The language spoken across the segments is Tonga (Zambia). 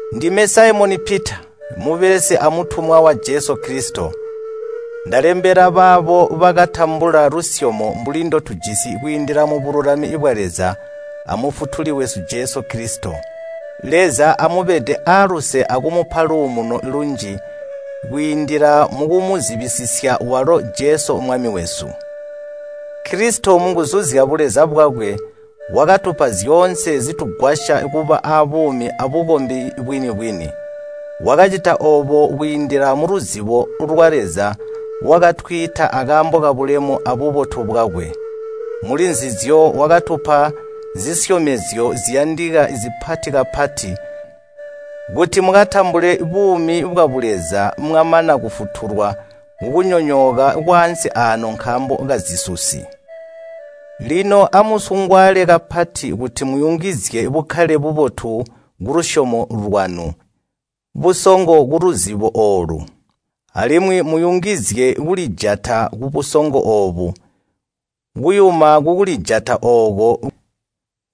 Ndime Saimoni Pita, mubelesi amutumwa wa Jesu Kilisito, ndalembela baabo bakatambula lusyomo mbuli ndotujisi kwiindila mubululami bwa Leza a Mufutuli wesu Jesu Kilisito. Leza amubede aaluse akumupa luumuno lunji kwiindila mukumuzibisisya walo a Jesu Mwami wesu. Kilisito munguzu zyabuleza bwakwe wakatupa zyoonse zitugwasya kuba aabuumi abukombi bwini-bwini. Wakacita oobo kwiindila muluzibo lwa Leza wakatwiita akaambo kabulemu abubotu bwakwe. Mulinzizyo wakatupa zisyomezyo ziyandika zipati kapati kuti mukatambule buumi bwabuleza mwamana kufutulwa kukunyonyooka kwaansi aano nkaambo kazisusi. Lino amusungwaale kapati kuti muyungizye bukkale bubotu kulusyomo lwanu, busongo kuluzibo oolu. Alimwi muyungizye kulijata kubusongo oobo, kuyuma kukulijata ooko,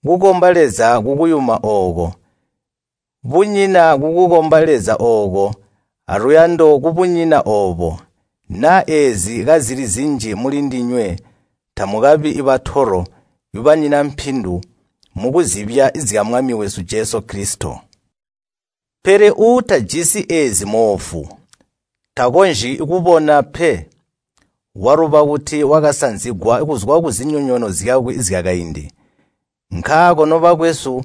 kukomba Leza kukuyuma ooko, bunyina kukukomba Leza ooko, aluyando kubunyina oobo. Naa eezi kazili zinji mulindinywe tamukabi batolo, banyina mpindu mukuzibya zya Mwami wesu Jesu Kilisito. Pele uutajisi eezi mmoofu, takonzyi kubona pe. Waluba kuti wakasanzigwa kuzwa kuzinyonyoono zyakwe zyakaindi. Nkaako, nobakwesu,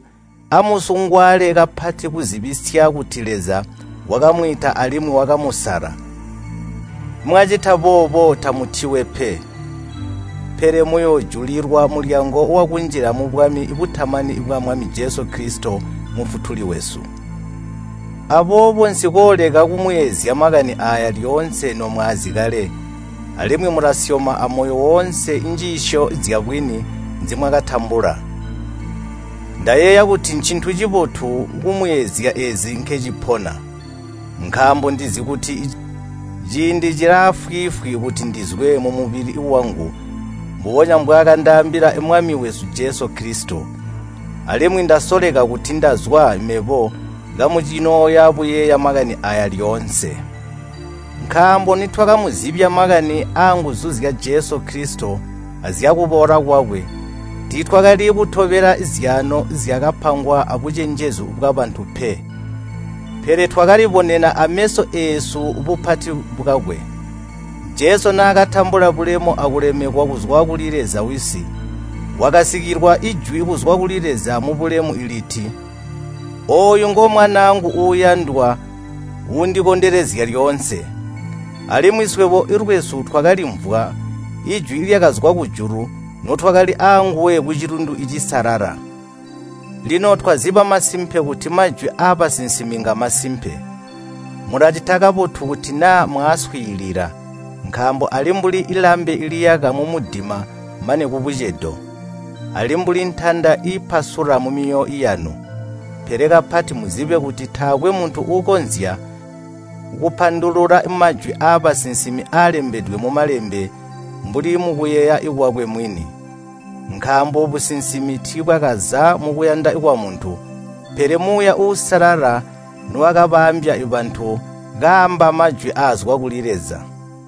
amusungwaale kapati kuzibisya kuti Leza wakamwiita alimwi wakamusala. Mwacita boobo, tamutiwe pe, pele muyoojulilwa mulyango wakunjila mubwami butamani bwa Mwami Jesu Kilisito Mufutuli wesu. Aboobo nsikooleka kumuyeezya makani aaya lyoonse nomwaazi kale, alimwi mulasyoma amoyo woonse njiisyo zyabwini nzimwakatambula. Ndayeeya kuti ncintu cibotu kumuyeezya eezi nkecipona. Nkaambo ndizi kuti ciindi cilaafwiifwi kuti ndizwe mumubili wangu mbubonya mbwaakandaambila Mwami wesu Jesu Kilisito. Alimwi ndasoleka kuti ndazwa mebo kamucinooya buyeeya makani aaya lyoonse. Nkaambo nitwakamuzibya makani anguzu zya Jesu Kilisito azyakuboola kwakwe tiitwakali kutobela zyaano zyakapangwa abucenjezu bwabantu pe. Pele twakalibonena ameso eesu bupati bwakwe. Jesu naakatambula bulemu akulemekwa kuzwa kuli Leza Wisi, wakasikilwa jwi kuzwa kuli Leza wabulemu liti, “Ooyu ngomwanaangu uuyandwa uundikondelezya lyoonse.” Alimwi swebo lwesu twakalimvwa jwi lyakazwa kujulu notwakali aanguwe kucilundu cisalala. Lino twaziba masimpe kuti majwi aabasinsimi ngamasimpe. Mulacita kabotu kuti naa mwaaswiilila, nkaambo ali mbuli lambe liyaka mumudima mane kubucedo. Ali, mbuli ntanda iipasula mumyoyo yanu. Pele kapati muzibe kuti taakwe muntu uukonzya kupandulula majwi aabasinsimi aalembedwe mu Malembe mbuli mukuyeeya kwakwe mwini. Nkaambo majwi aabusinsimi taakaza mukuyanda kwamuntu mwini pe, pele Muuya Uusalala nowakabaambya ndendilyo nibakaamba majwi aa Leza.